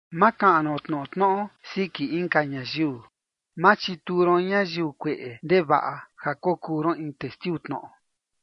’Ma kaꞌan ron tnoꞌo tnoꞌo siki inka ñayiu. Ma chituu ron ñayiu kueꞌe ndevaꞌa ja kokuu ron in testiu tnoꞌo.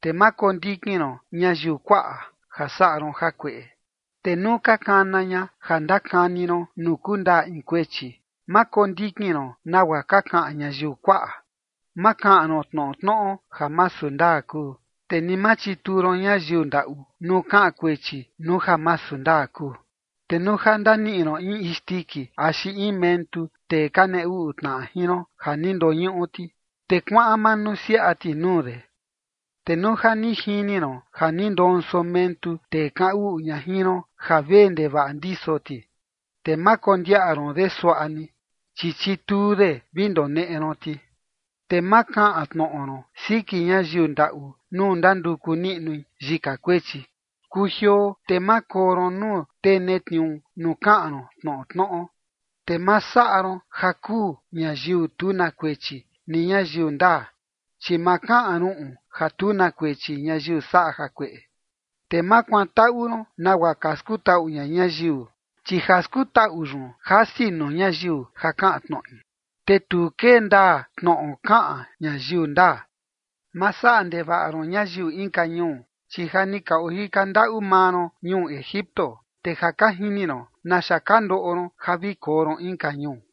’Te ma kondikin ron ñayiu kuaꞌa ja saꞌa ron jakueꞌe. Te nuu ka kana ña ja ndakani ron nuu kundaa in kuechi, ma kondikin ron nagua ka kaꞌan ñayiu kuaꞌa. Ma kaꞌan ron tnoꞌo tnoꞌo ja masu ndaa kuu. Te ni ma chituu ron ñayiu ndaꞌu nuu kaꞌan kuechi nuu ja masu ndaa kuu. ’Te nuu ja ndaniꞌi ron in isndiki axi in mentu tee ka nee uꞌu tnaꞌa jin ron ja ni ndoñuꞌu ti, te kuaꞌan manusiaꞌa ti nuu de. Te nuu ja ni jini ron ja ni ndonso mentu tee kaꞌan uꞌu ña jin ron ja vee ndevaꞌa ndiso ti, te ma kondiaꞌa ron de suaꞌa ni, chi chituu de vi ndoneꞌe ron ti. ’Te ma kaꞌan tnoꞌo ron siki ñayiu ndaꞌu nuu ndanduku niꞌnui yika kuechi. ’Kujioo te ma koo ron nuu tee netniuu nuu kaꞌan ron tnoꞌo tnoꞌo. Te ma saꞌa ron ja kuu ñayiu tu na kuechi ni ñayiu ndaa, chi ma kaꞌan ruꞌun ja tu na kuechi ñayiu saꞌa jakueꞌe. ’Te ma kuantaꞌu ron nagua ka skutaꞌu ña ñayiu, chi ja skutaꞌu yun jasi nuu ñayiu ja kaꞌan tnoꞌi, te tu kee ndaa tnoꞌo kaꞌan ñayiu ndaa. ’Ma saꞌa ndevaꞌa ron ñayiu inka ñuu, chi ja ni ka ojika ndaꞌu maa ron ñuu Egipto, te ja ka jini ron naxa ka ndoꞌo ron ja vi koo ron inka ñuu.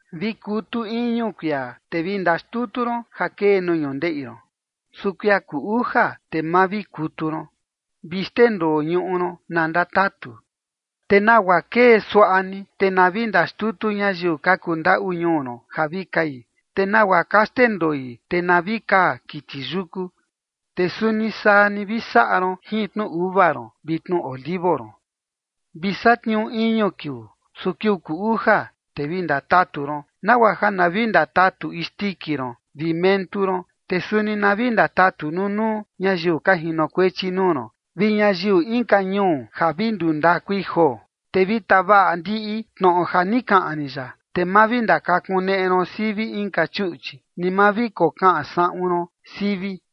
’Vi kutu iñu kuia, te vi ndaxtutu ron ja kee nuu ñundeꞌi ron. Su kuia kuu uja, te ma vi kutu ron. Vi xndendoo ñuꞌu ron na ndatatu, te nagua kee suaꞌa ni, te na vi ndaxtutu ñayiu ka kundaꞌu ñuu ron ja vi kai. Te nagua ka xndendoi, te na vi kaa kiti yuku. Te suni saa ni vi saꞌa ron jin tnu uva ron vi tnu olivo ron. ’Vi satniuu iñu kiuu, su kiuu kuu uja, te vi ndatatu ron, nagua ja na vi ndatatu isndiki ron vi mentu ron, te suni na vi ndatatu nunuu ñayiu ka jinokuechi nuu ron vi ñayiu inka ñuu ja vi nduu ndakui joo. ’Te vi tavaꞌa ndiꞌi tnoꞌo ja ni kaꞌan rin yaꞌa. Te ma vi ndakakuneꞌe ron sivi inka chuꞌchi, ni ma vi kokaꞌan saꞌun ron sivi.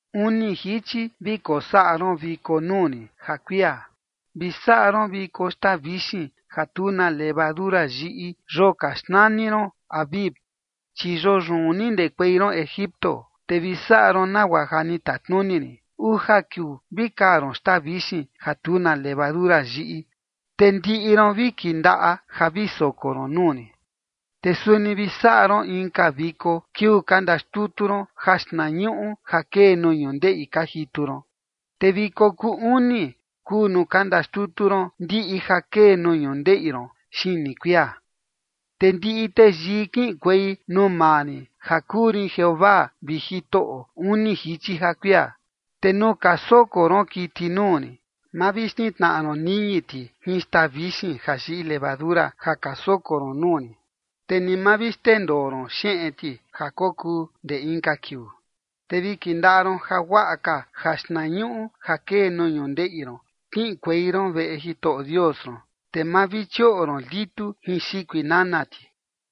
’Uni jichi vi kosaꞌa ron viko nuu rin ja kuia. Vi saꞌa ron viko xtaa vixin ja tu na levadura yiꞌi yoo ka xnani ron Abib, chi yoo yun ni ndekuei ron Egipto. Te vi saꞌa ron nagua ja ni tatnuni rin: uja kiuu vi kaa ron xtaa vixin ja tu na levadura yiꞌi. Te ndiꞌi ron vi kindaꞌa ja vi soko ron nuu rin. ’Te suni vi saꞌa ron inka viko kiuu ka ndaxtutu ron jaxtnañuꞌu ja kee nuu ñundeꞌi ka jitu ron. Te viko kuu uni kuu nuu ka ndaxtutu ron ndiꞌi ja kee nuu ñundeꞌi ron xini kuia. ’Te ndiꞌi teyii kiꞌinkuei nuu maa rin ja kuu rin Jeovaa vi Jitoꞌo uni jichi ja kuia. ’Te nuu ka soko ron kiti nuu rin, ma vi xnitnaꞌa ron niñi ti jin xtaa vixin ja yiꞌi levadura ja ka soko ron nuu rin, te ni ma vi xndendoo ron xeꞌen ti ja kokuu ndee inka kiuu. ’Te vi kindaꞌa ron jaguaꞌa ka jaxtnañuꞌu ja kee nuu ñundeꞌi ron kiꞌinkuei ron veꞌe Jitoꞌo Dios ron. Te ma vi chioꞌo ron litu jin xikui nana ti.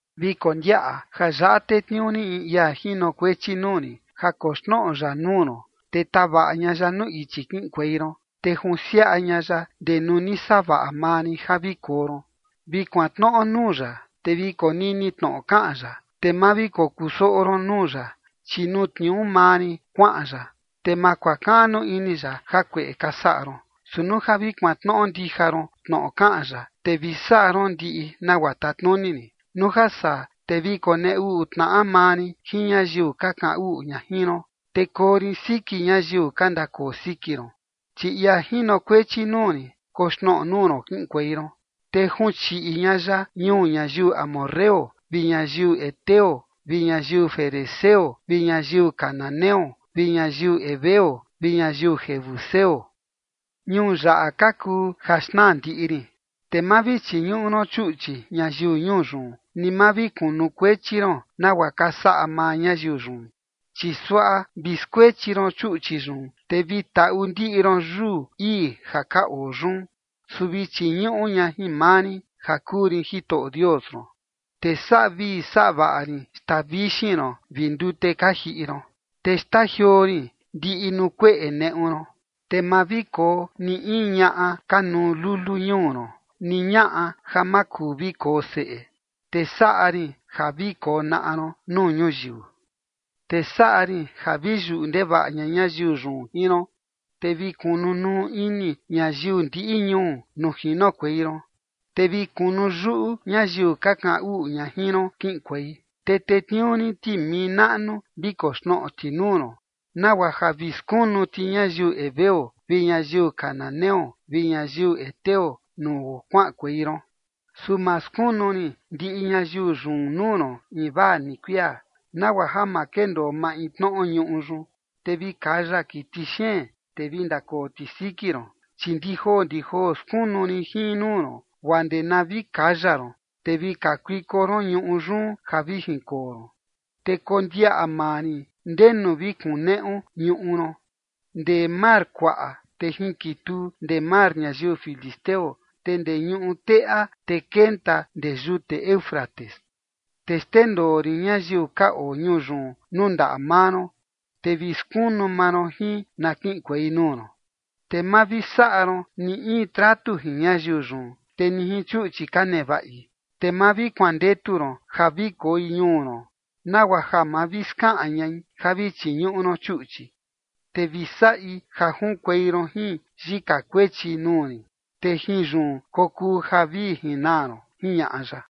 ’Vi kondiaꞌa ja yaꞌa tetniuu rin in ia jinokuechi nuu rin ja koxnoꞌo ya nuu ron, te tavaꞌa ña ya nuu ichi kiꞌinkuei ron, te junsiaꞌa ña ya ndee nuu ni savaꞌa maa rin ja vi koo ron. Vi kuantnoꞌo nuu ya, te vi konini tnoꞌo kaꞌan ya, te ma vi kokusoꞌo ron nuu ya, chi nuu tniuu maa rin kuaꞌan ya, te ma kuakaꞌnu ini ya jakueꞌe ka saꞌa ron. Su nuu ja vi kuantnoꞌo ndija ron tnoꞌo kaꞌan ya, te vi saꞌa ron ndiꞌi nagua tatnuni rin, nuu ja saa, te vi konee uꞌu tnaꞌa maa rin jin ñayiu ka kaꞌan uꞌu ña jin ron, te koo rin siki ñayiu ka ndakoo siki ron. Chi ia jinokuechi nuu rin koxnoꞌo nuu ron kiꞌinkuei ron, te junchiꞌi ña ya ñuu ñayiu amorreo vi ñayiu heteo vi ñayiu ferezeo vi ñayiu cananeo vi ñayiu heveo vi ñayiu jebuseo. Ñuu yaꞌa ka kuu ja xnaa ndiꞌi rin. Te ma vi chiñuꞌu ron chuꞌchi ñayiu ñuu yun, ni ma vi kunukuechi ron nagua ka saꞌa maa ñayiu yun, chi suaꞌa vi skuechi ron chuꞌchi yun, te vi taꞌu ndiꞌi ron yuu ii ja ka oo yun. Su vi chiñuꞌu ña jin maa rin ja kuu rin Jitoꞌo Dios ron, te saꞌa vii saꞌa vaꞌa rin xtaa vixin ron vi ndute ka jiꞌi ron. ’Te xtajioo rin ndiꞌi nuu kueꞌe neꞌu ron. Te ma vi koo ni in ñaꞌa ka nuu lulu ñuu ron, ni ñaꞌa ja ma kuu vi koo seꞌe, te saꞌa rin ja vi konaꞌa ron nuu ñuyiu. ’Te saꞌa rin ja vi yuꞌu ndevaꞌa ña ñayiu yun jin ron, te vi kunu nuu ini ñayiu ndiꞌi ñuu nuu jinokuei ron, te vi kunu yuꞌu ñayiu ka kaꞌan uꞌu ña jin ron kiꞌinkuei. Te tetniuu rin timii naꞌnu vi koxnoꞌo ti nuu ron, nagua ja vi skunu ti ñayiu heveo vi ñayiu cananeo vi ñayiu heteo nuu kuaꞌankuei ron. Su ma skunu rin ndiꞌi ñayiu yun nuu ron invaa ni kuia, nagua ja ma kendoo maintnoꞌo ñuꞌu yun, te vi kaya kiti xeen, te vi ndakoo ti siki ron. Chi ndijoo ndijoo skunu rin jin nuu ron, guaa ndee na vi kaya ron, te vi kakuiko ron ñuꞌu yun ja vi jinkoo ron. Te kondiaꞌa maa rin ndenu vi kuneꞌu ñuꞌu ron, ndee mar kuaꞌa, te jinkituu ndee mar ñayiu filisteo, te ndee ñuꞌu teꞌa te kenta ndee yute Éufrates. Te xndendoo rin ñayiu ka oo ñuu yun nuu ndaꞌa maa ron, te vi skunu maa ron jin na kiꞌinkuei nuu ron. ’Te ma vi saꞌa ron ni in tratu jin ñayiu yun, te ni jin chuꞌchi ka nevaꞌi. Te ma vi kuandetu ron ja vi koi ñuu ron nagua ja ma vi skaꞌan ñai ja vi chiñuꞌu ron chuꞌchi, te vi saꞌi ja junkuei ron jin yika kuechi nuu rin, te jin yun kokuu ja vi jinaa ron ―jiñaꞌa ya.